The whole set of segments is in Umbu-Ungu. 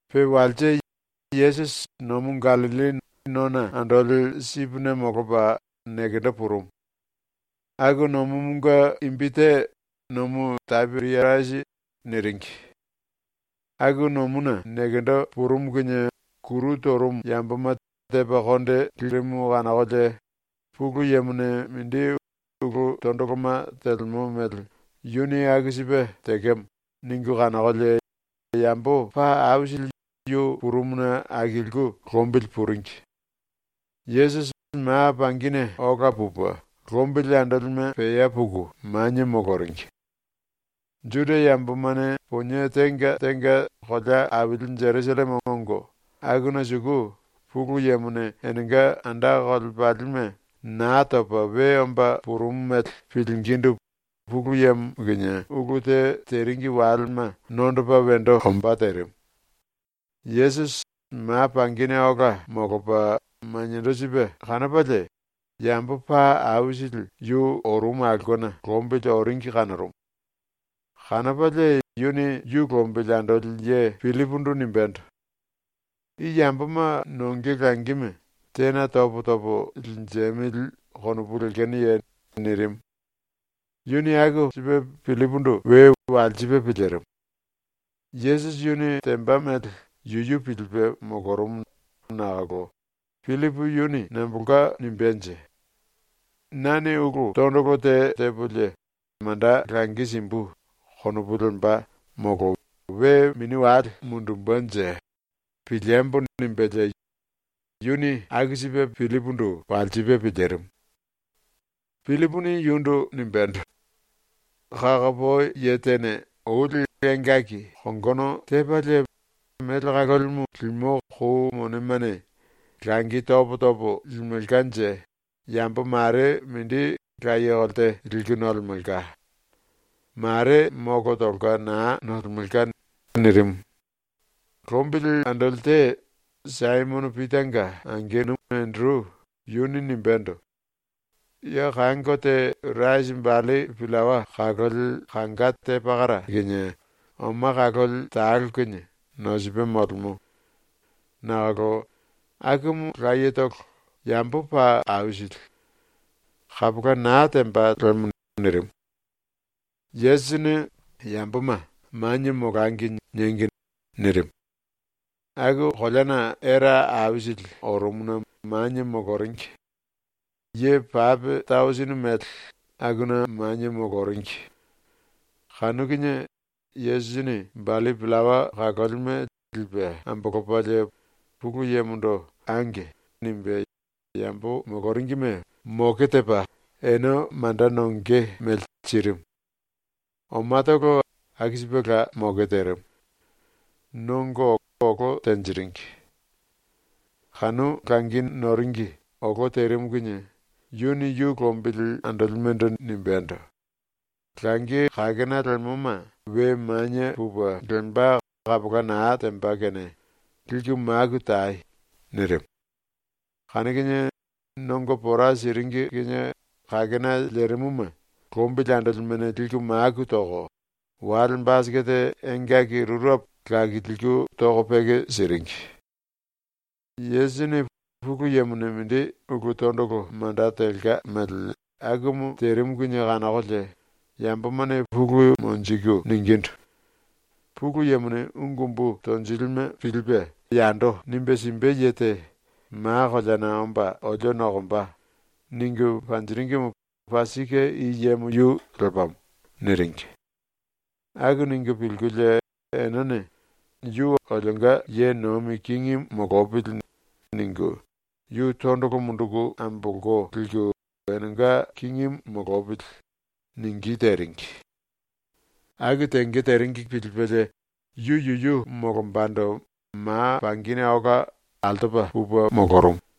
Pe walse Yesusi Nomu Gallilli nona andoli sipine molopa nekendo purumu. (Aku nomumunge imbi te ‘Nomu Tapiriasi’ niringi.) Aku nomuna nekendo purumu kinie kuru torumu yamboma tepa konde lirimu kanokolie ‘Pulu Yemone mindi ulu tondoloma telemo mele yuni aku sipe tekemo.’ ningu kanokolie yambo paa aisili yu purumuna akiliku lombili puringi. Yesusi ma pangine ola pupe lombili andolime pea puku manie moloringi. Juda yambomane ⸤ponie tenga tenga kolea aili Jerusalleme ongo akuna suku⸥ Pulu Yemone enenga anda kolepalime Naa Topa We Omba Purumu mele pilingindu Pulu Yemo kinie ulu te teringi walema nondopa wendo ombá terimu. Yesusi ma pangine ola molopa maniendo sipe kanopalie yambo paa aisili yu orumu aulkena lombili oringi kanorumu. Kanopalie yuni yu lombili andoli ye Pillipundu nimbendo: “I yamboma nonge langime tena topo topo linjemili konopu lekenoye?” nirimu. Yuni aku sipe Pillipundu we walsipe pilirimu. Yesusi yuni temba mele yuyu pilipe molorumu nakolo ‘Pillipu yuni nambolka nimbenje? ‘Nane ulu tondolo te tepolie manda langi simbu.’ konopu lemba, molo we mini wale mundumbenje piliembo.’ nimbelie yuni aku sipe Pillipundu walsipe pilirimu. Pillipuni yundu nimbendo: “Kakopoi ye tene oli engaki kongono tepalie mele kalolimu limo kou monemane langi topo topo limelkanje yambo mare mindi laye kolte liku nolemelka. Mare molo tolka naa nolemelka.” nirimu. Lombili andoli te, Saimono Pitanga angenu Enderu, yuni nimbendo: “Ya kango te rasi balli pillawa kaloli kanga te pakara kinie oma kaloli talo kinie nosipe molemo. Nakolo akumu layetolo, yambo paa aisili. Kapola naa temba lemo.” nirimu. Yesusini “Yamboma “Manie molangi.” niengi.” nirimu. Aku koleana era aisili orumuna manie moloringi. Ye pape tausini mele akuna manie moloringi. Kanu kinie Yesusini balli pillawa kalolime lipe ambolopalie Pulu Yemondo “Ange.” nimbe yambo moloringime moke tepa ene manda nonge mele sirimu. Omatolo aku sipela moke terimu. Nongo olo tenjiringi. Kanu langi noringi olo terimu kinie yuni yu lombili andolimendo nimbendo: “Langi kakena lemoma we manie pupe lemba kapola naa temba kene liku maku tai.” nirimu. Kanu kinie nongo pora siringi kinie kakena lerimuma lombili andolimene liku maku toko wale basikete engaki rurepo lakilku toko peke siringi. Yesusini Pulu Yemone mindi ulu tondolo manda telka mele akumu terimu kinie kanokolie yambomane pulu monjiku ningindu: “ “Pulu Yemone ungu umbu tonjilime pilipe yando nimbe simbe ye te ma koleana omba olio nokomba.” ningu panjiringimu paa sike i yemo yu lepamo.” niringi. Aku ningu pilkulie enene ‘Yu olionga ye nomi kingimu molopili.’ ningu yu tondolo munduku ambolko liku ‘enenga kingimu molopili.’ ningí teringi. Aku tenge teringi pilipelie yu yuyu molombando ma pangine ola altopa pupe molorumu.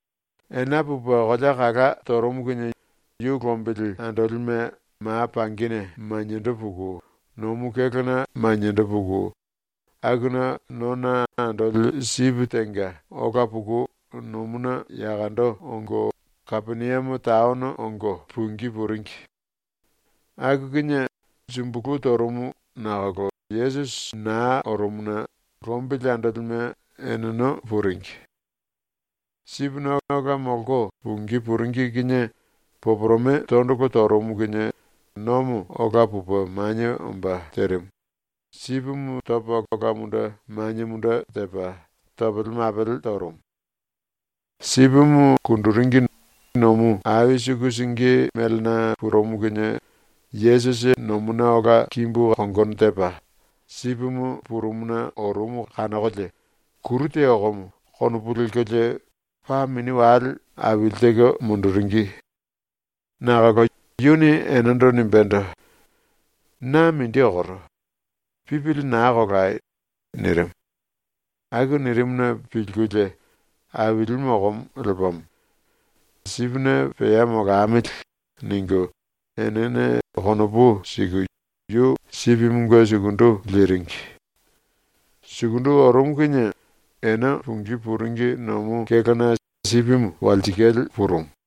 Ena pupe kolea kala torumu kinie yu lombili andolime ma pangine maniendo puku nomu kélona maniendo puku akuna nona andoli sipi tenga ola puku nomuna yakondo ongo Kapeniame taono ongo pungí puringi. Aku kinie sumbulu torumu nakolo Yesusi naa orumuna lombili andolime eneno puringi. ⸤Sipine ola molko pungí puringi kinie⸥ poporome tondolo torumu kinie nomo ola pupe manie omba terimu, sipimu topa ola munde manie munde tepa topele mapele torumu. Sipimu kunduringi nomu ai suku síngi melena purumu kinie Yesusi nomuna ola kimbu kongono tepa sipimu purumuna orumu kanokolie ‘Kuru te okomo.’ konopu lelkolie paa mini wale aili teko munduringi. Nakolo yuni enendo nimbendo: “Na mindi okoro, pipili naa kolai.” nirimu. Aku nirimuna pilkulie “⸤Ailimu okomo lepamo.⸥ Sipine pea molamili.” ningu enene konopu siku yu sipimunge sukundu liringi. Sukundu orumu kinie ene pungí puringi nomu kélona sipimu walsikale purumu.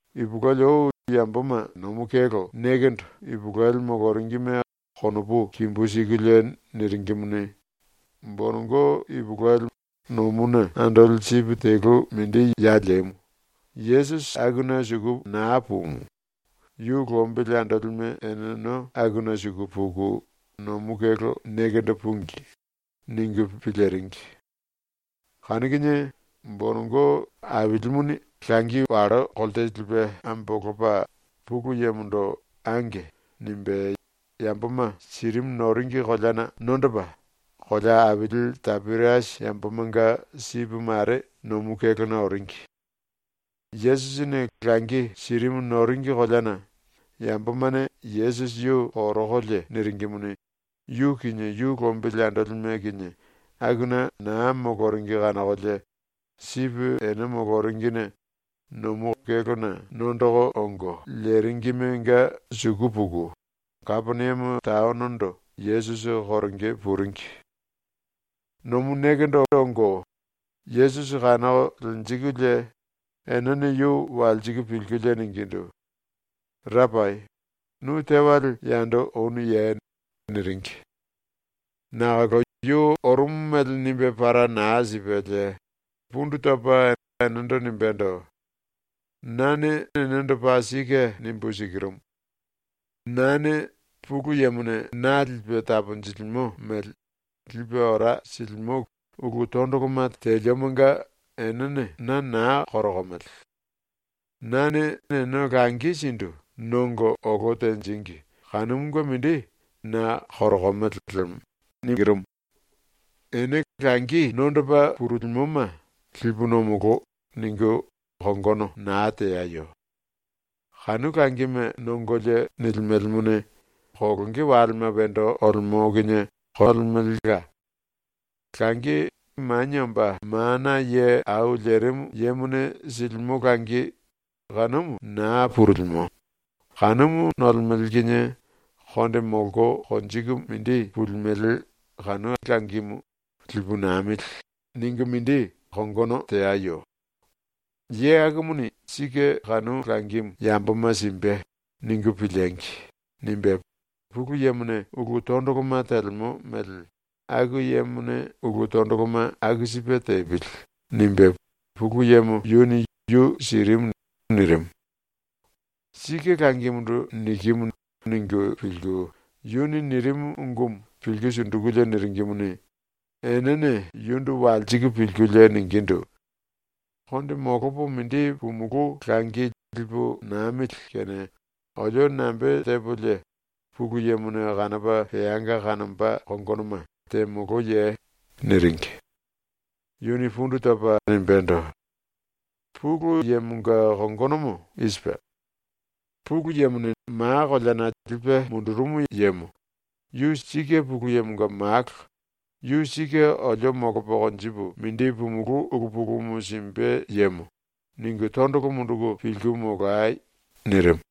Ipulueli ou yamboma nomu kélo nekendo ipulueli moloringime konopu kimbu sikulie niringimuni, ‘Bonongo ipulueli nomuna andoli sipi telu mindi ya lemu, Yesusi akuna suku naa pumu, yu lombili andolime eneno akuna suku puku nomu kélo nekendo púngi.’ ningu piliringi. Kanu kinie bonongo Ailimuni langi wallo kolte lipe ambolopa Pulu Yemondo “Ange.” nimbe yamboma sirimu noringi koleana nondopa kolea aili Tapiriasi yambomanga sipi mare nomu kélona oringi. Yesusini langi sirimu noringi koleana yambomane Yesusi yu korokolie niringimuni, yu kinie yu lombili andolime kinie akuna naa moloringi kanokolie sipi ene moloringine nomu kélona nondoko ongo leringimenga suku puku Kapeniame taonondo Yesusi koronge puringi. Nomu nekendo ongo Yesusi kanoko lenjikulie enene yu walsiku pilkulie ningindu: “Rapai, nu tewale yando onuye?” niringi. Nakolo yu orumu mele nimbe para naa sipelie pundu topa enendo nimbendo: “Nane enendo paa sike nimbu sikirumu: Nane ⸤Pulu Yemone na lipe taponjilimo mele⸥ lipe ora silimo ulu tondoloma teliomonga enene na naa korokomele. Nane ene langi sindu nongo olo tenjíngi kanumunge mindi na korokomele lemo. Ene langi nondopa purulimoma ‘Lipu nomolo.’ ningu kongono naa teayo. Kanu langime nongolie nilimelemone, kolonge walema wendo olemo kinie kolemelela. Langi, Manie Omba Mana Ye Au Lerimu Yemone silimo langi, kanumu naa purulimo, kanumu nolemele kinie konde molko konjiku mindi pulimele kanu langimu ‘Lipu namili.’ ningu mindi kongono teayo. ‘ ‘Ye akumuni sike kanu langimu yamboma simbe.’ ningu piliengi!’ nimbe Pulu Yemone ulu tondoloma telemo mele ‘Aku yemone ulu tondoloma aku sipe tepili.’ nimbe Pulu Yemo yuni yu sirimu.” nirimu. ⸤‘Sike langimundu nikimu.’ ningu pilku yuni nirimu ungumu pilku sundukulie niringimuni,⸥ enene yundu walsiku pilkulie ningindu: “Konde molopo mindi pumulú langi lipu namili kene olio nambe tepolie Pulu Yemone kanopa peanga kanomba kongonoma temoloye?” niringi. Yuni pundu topa nimbendo: “Pulu Yemonga kongonomo i sipe: ‘Pulu Yemone ma koleana lipe mundurumu yemo yu sike Pulu Yemonga malo, ⸤yu sike olio molopo konjipu mindi pumulú ulu pulumu simbe yemo⸥.’ ningu tondolo munduku pilku molai.” nirimu.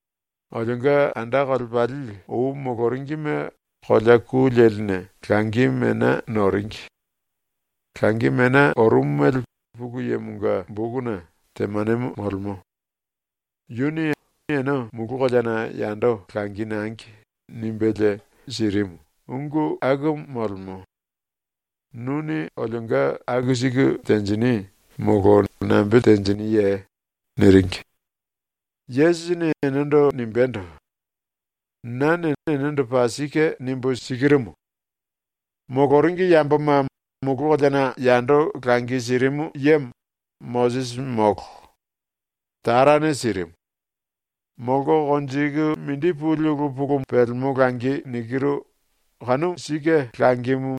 “Olionga anda kolepali ou moloringime kolea ku leline langi mena noringi. Langi mena orumu mele Pulu Yemonga bokuna temanemo molemo: ‘Yuni ‘Ene mulu koleana yando langi nangi.’ nimbelie sirimu.’ ungu akumu molemo. ⸤Nuni olionga aku siku tenjini molo nambe tenjiniye?⸥” niringi. Yesusini enendo nimbendo: “Nane enendo paa sike nimbu sikirumu: Moloringi yamboma mulu koleana yando langi sirimu yemo Mosisi molo. Tarane sirimu. Molko konjiku mindi puli ulu pulu pelemo langi nikiru kanu sike langimu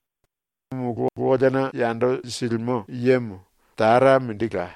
mulu koleana yando silimo yemo Tara mindila.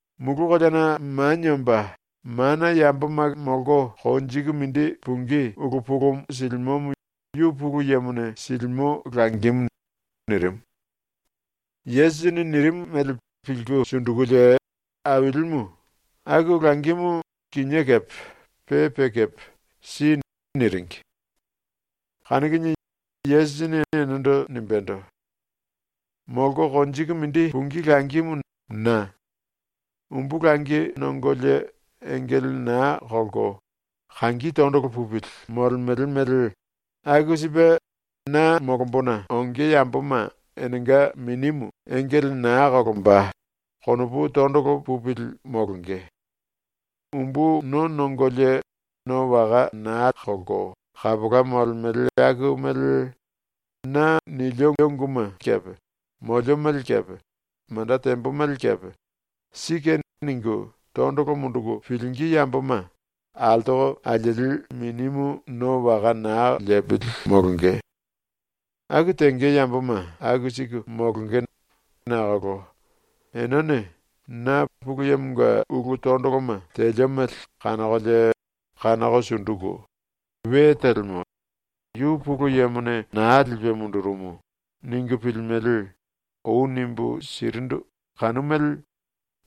Mulu koleana manie omba mana yamboma molko konjiku mindi pungí ulu pulumu silimomo yu Pulu Yemone silimo langimu.” nirimu. Yesusini nirimu mele pilku sundukulie, “Ailimu, aku langimu kinié kepe pe pe kepe si.” niringi. Kanu kinie Yesusini enendo nimbendo: “Molko konjiku mindi pungí langimu na. Umbu langi nongolie engele naa kolko kangi tondolo pupili molemele mele aku sipe na molombona onge yamboma enenga minimu engele naa kolomba, konopu tondolo pupili molonge. Umbu no nongolie no waka naa kolko kapola molemele aku mele na nilio unguma kepe molio mele kepe manda tembo mele kepe ‘Sike.’ ningu tondolo munduku pilingí yamboma altoko alieli minimu no waka naa lepili molonge. Aku tenge yamboma aku siku molonge nakolo “Enene na ⸤Pulu Yemonga ulu tondoloma telio mele⸥ kanokolie kanoko sunduku ‘We telemo. Yu Pulu Yemone naa lipe mundurumu.’ ningu pilimele.” ou nimbu sirindu kanu mele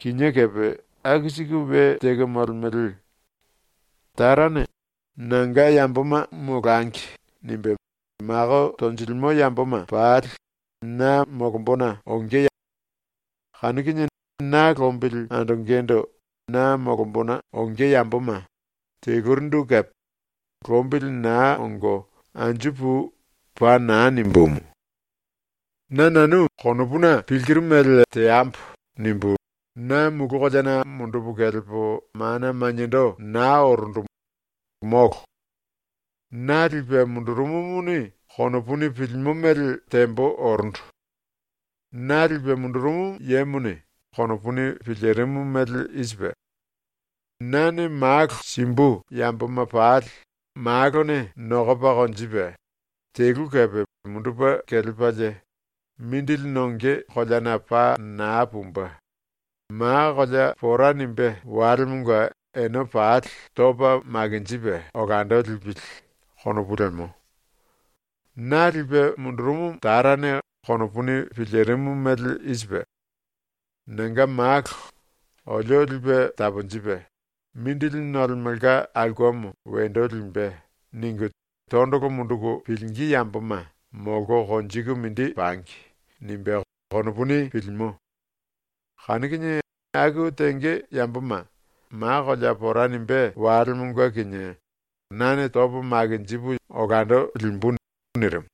kinié kepe aku siku we teko molemele. Tarane ‘Nanga yamboma molangi.’ nimbe mako tonjilimo yamboma pali na molombona ongo na tondolo munduku pilingí. Kanu kinie na lombili andongendo na molombona onge yamboma telurindu kepe “Lombili naa ongo anju pui.” paa naa nimbumu. “‘Na nanu konopuna pilkiru mele teambo.’ nimbu na mulu koleana mundupu kelepo mana maniendo naa orundu, molo. Na lipe mundurumumuni konopuni pilimo mele tembo orundu. Na lipe mundurumu yemone konopuni pilirimu mele i sipe: ‘Nane ⸤Malo⸥ simbu yamboma pali ⸤Malone⸥ nokopa konjipe, telu kepe mundupe kelepalie, mindili nonge koleana paa naa pumbe, ma kolea pora nimbé walemonga ene pali topa makinjipe olando lipili.’ konopu lemo. Na lipe mundurumu Tarane konopuni pilirimu mele i sipe: ‘Nanga malo ‘olio lipe taponjipe, mindili nolemolka aulkemo wendo limbe.’ ningu tondolo munduku pilingí yamboma molko konjiku mindi pangi.’ nimbe konopuni pilimo. Kanu kinie aku tenge yamboma ma kolea pora nimbé walemonga kinie nane topo makinjipu olando limbu.” nirimu.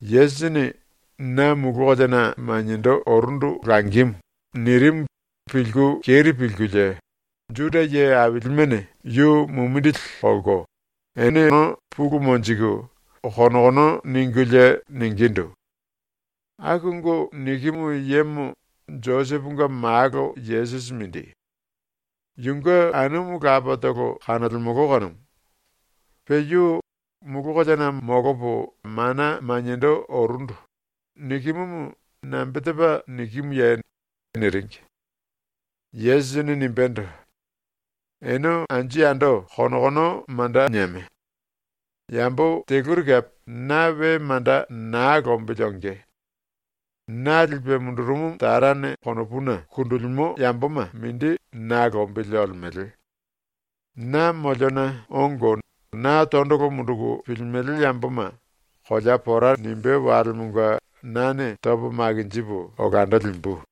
Yesusini “Na mulu koleana maniendo orundu langimu.” nirimu pilku keri pilkulie Juda ye ailimene yu mumindili kolko eneno pulu monjiku konokono ningulie ningindu: “Aku ungu nikimu yemo Joseponga malo Yesusi mindi. Yunge anumu lapatolo kanolemolo kanumu. Pe yu “Mulu koleana molopo mana maniendo orundu.” nikimumu nambe tepa nikimuye?” niringi. Yesusini nimbendo: “Ene anju yando konokono manda nieme! Yambo teluri kepe na we manda naa lombili onge. Na lipe mundurumu Tarane konopuna kundulimo yamboma mindi na lombili olemele. Na moliona ongo na tondolo munduku pilimele yamboma kolea pora nimbé walemonga nane topo makinjipu olando limbu.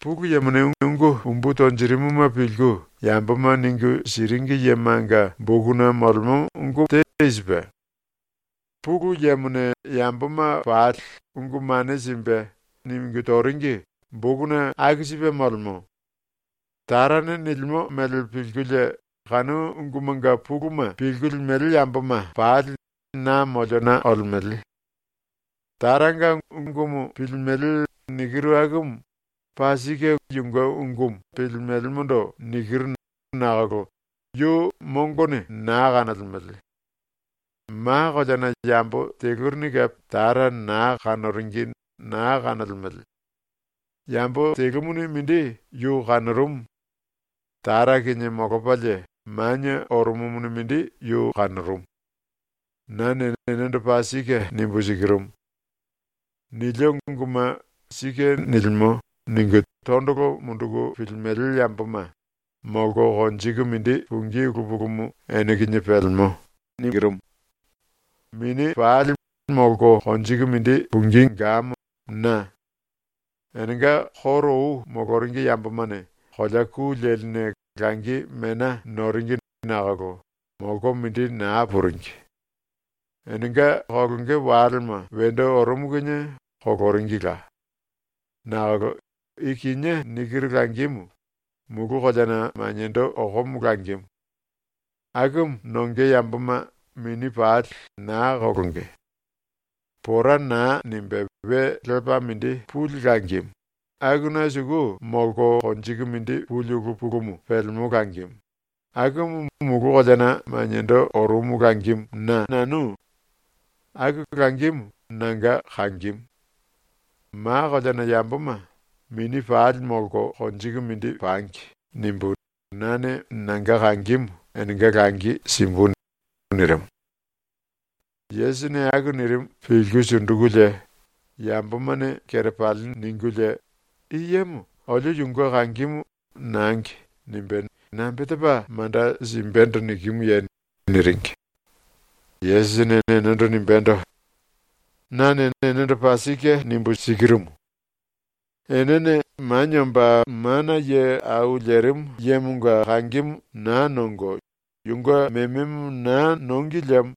Pulu Yemone ungu umbu tonjirimuma pilku yamboma ningu siringi yemanga bokuna molemo ungu te i sipe: “Pulu Yemone yamboma pali ungu mane simbe.” ningu toringi bokuna aku sipe molemo. Tarane nilimo mele pilkulie kanu ungumanga puluma pilku limele yamboma pali na moliona olemele. Taranga ungumu pilimele nikiru akumu paa sike yunge ungumu pilimelemondo nikiru nakolo yu mongone naa kanolemele. Ma koleana yambo telurini kepe Tara naa kanoringi naa kanolemele. Yambo telumuni mindi yu kanorumu. Tara kinie molopalie manie orumumuni mindi yu kanorumu. “Nane enendo paa sike nimbu sikirumu: Nilio unguma ‘Sike nilimo.’ ningu tondolo munduku pilimele yamboma molko konjiku mindi pungí ulu pulumu ene kinie pelemo. Mini pali molko konjiku mindi pungí gamo na. Enenga koro ou moloringi yambomane kolea ku leline langi mena noringi nakolo molko mindi naa puringi. Enenga kolonge walema wendo orumu kinie koloringila. “Nakolo i kinié nikiru langimu mulu koleana maniendo okomo langimu. Akumu nonge yamboma mini pali naa kolonge. Pora naa nimbe we lepa mindi puli langimu, akuna suku molko konjiku mindi puli ulu pulumu pelemo langimu, akumu mulu koleana maniendo orumu langimu na. Aku langimu nanga kangimu. ‘Ma koleana yamboma, mini pali molko konjiku mindi pangi.’ nimbu nane nanga kangimu enenga langi simbu.” nirimu. ⸤Yesusini aku nirimu pilku sundukulie⸥ yambomane kerepali ningulie, “I yemo olio yunge kangimu “Nangi.” nimbe nambe tepa manda simbendo nikimuye?” niringi. Yesusini enendo nimbendo: “Nane enendo paa sike nimbu sikirumu: Enene Manie Omba Mana Ye Au Lerimu Yemonga kangimu naa nongo yunge mememo naa nongi liemo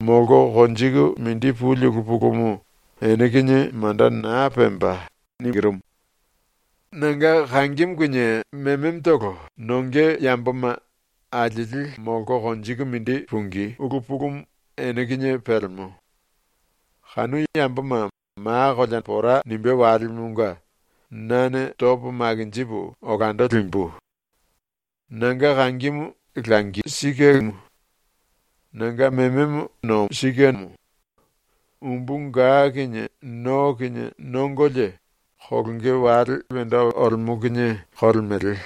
molko konjiku mindi puli ulu pulumu ene kinie manda naa pemba. Nanga kangimu kinie mememotolo nonge yamboma alieli molko konjiku mindi pungí ulu pulumu ene kinie pelemo. Kanu yamboma ma kolea pora nimbé walemonga nane topo makinjipu olando limbu. “Nanga kangimu sike langimu; nanga mememo sike nomo. Umbu ga kinie no kinie nongolie, kolonge wale wendo olemo kinie kolemele.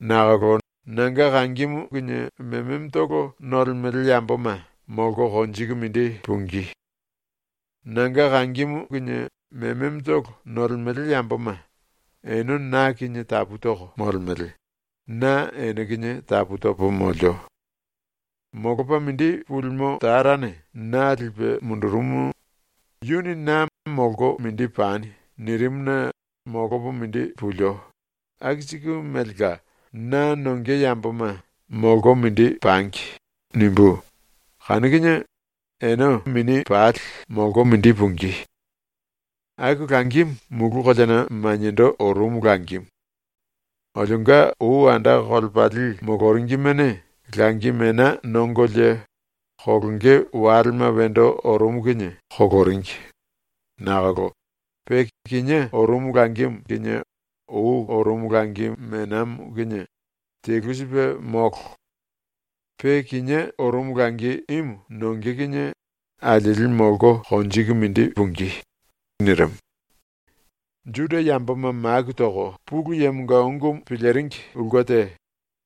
Nakolo nanga kangimu kinie mememotolo nolemele yamboma molko konjiku mindi pungí. Nanga kangimu kinie mememotolo nolemele yamboma ene na kinie tapu toko molemele, na ene kinie tapu topo molio. Molopa mindi pulimo Tarane na lipe mundurumu, yuni na ‘Molko mindi pani.’ nirimuna molopo mindi pulio, aku siku melela na nonge yamboma ‘Molko mindi pangi.’ nimbú, kanu kinie ene mini pali molko mindi pungí. Aku langimu mulu koleana maniendo orumu langimu. Olionga ou anda kolepali moloringimene langi mena nongolie ⸤kolonge walema wendo orumu kinie⸥ koloringi, nakolo pe kinié orumu langimu kinie ou orumu langi menamo kinie telu sipe molo. Pe kinié orumu langi imu nonge kinie alieli molko konjiku mindi pungí.” nirimu. Juda yamboma maku toko Pulu Yemonga ungumu piliringi ulke te,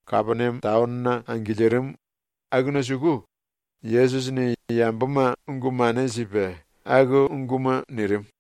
Kapeniame taonona angilirimu, akuna suku Yesusini yamboma ungu mane sipe aku unguma nirimu.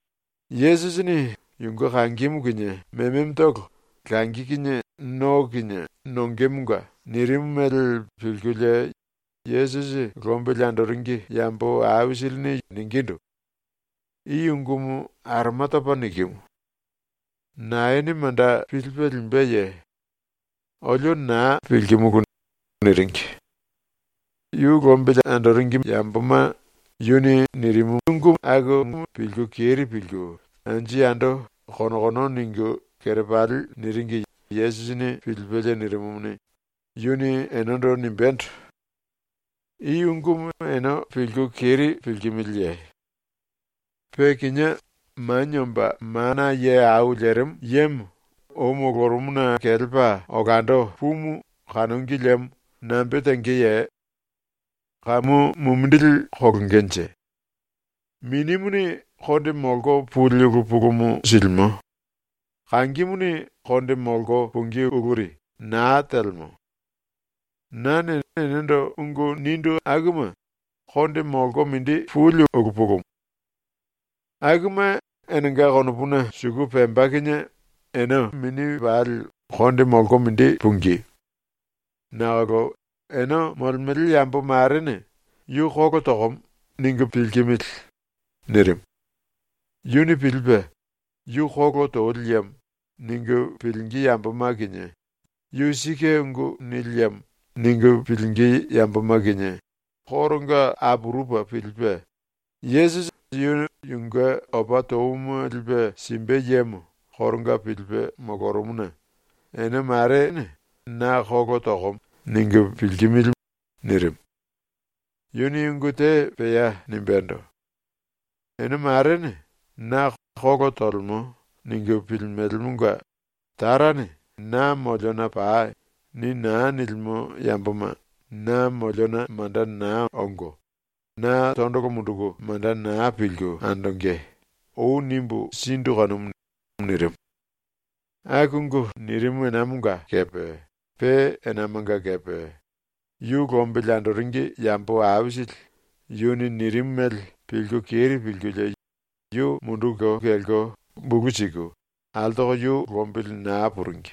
Yesusini ⸤yunge kangimu kinie mememotolo langi kinie no kinie nongemonga⸥ nirimu mele pilkulie Yesusi lombili andoringi yambo aisilini ningindu: “I ungumu aroma topa nikimu. Naene manda pilipe limbeye? Olio naa pilkimulu.” niringi. Yu lombili andoringi yamboma yu nirimumunge pilku keri pilku anju yando konokono ningu kerepali niringi Yesusini pilipelie nirimumuni, yuni enendo nimbendo: “I ungumu ene pilku keri pilkimiliye? Pe kinié Manie Omba Mana Ye Au Lerimu Yemo ou molorumuna kelepa olando pumu kanongi liemo nambe tengeye? Kamu mumindili kolongenje? “Minimuni konde molko puli ulu pulumu silimo; kangimuni konde molko pungí uluri naa telemo. Nane enendo ungu nindu akuma konde molko mindi puli ulu pulumu. Akuma enenga konopuna suku pemba kinie ene mini pali konde molko mindi pungí. Nakolo ene molemele yambo marene ‘yu kolo tokomo.’ ningu pilkimili.” nirimu. Yuni pilipe ‘Yu kolo toli yemo.’ ningu pilingí yamboma kinie ‘Yu sike ungu nili yemo.’ ningu pilingí yamboma kinie koronga apurupe pilipe, Yesusi yu yunge opa touma lipe simbe yemo koronga pilipe molorumuna “Ene mare na ‘Kolo tokomo.’ ningu pilkimili.” nirimu. Yuni ungu te pea nimbendo: “Ene marene na ‘Kolo tolemo.’ ningu pilimelemonga ‘Tarane “Na moliona pai.” ni naa nilimo yamboma na moliona manda naa ongo, na tondolo munduku manda naa pilku andonge.’ ou nimbu sindu kanumu.” nirimu. Aku ungu nirimu enamonga kepe pe enamanga kepe yu lombili andoringi yambo aisili yuni nirimu mele pilku keri pilkulie yu munduku kelko bulu siku altoko yu lombili naa puringi.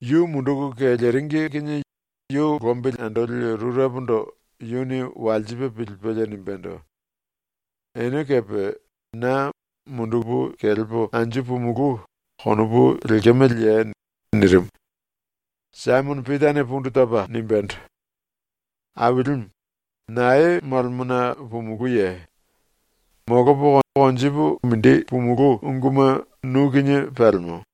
Yu munduku keleringi kinie yu lombili andoli rurepondo yuni walsipe pilipelie nimbendo: “Ene kepe na ‘mundupu kelepo anju pumulú.’ konopu lekemeleye?” nirimu. Saimono Pitane pundu topa nimbendo: “Ailimu, nae molemona pumulúye? Molopo konjipu mindi pumulú unguma nu kinie pelemo.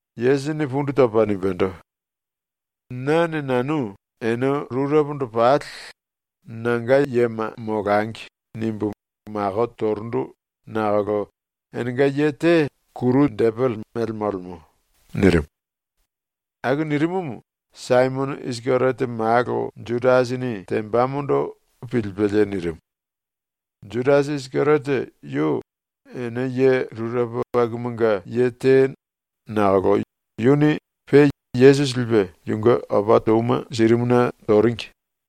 Yesusini pundu topa nimbendo: “Nane nanu ene rurepondo pali ‘Nanga yema molangi.’ nimbu mako torundu nakolo enenga ye te depele mele molemo.” nirimu. (Aku nirimumu Saimono Isikeriote malo Judasini tembamondo pilipelie nirimu. Judasi Isikeriote yu ene ye rurepo akumanga ye te nakolo yuni pe Yesusi lipe yunge opa touma sirimuna toringi.)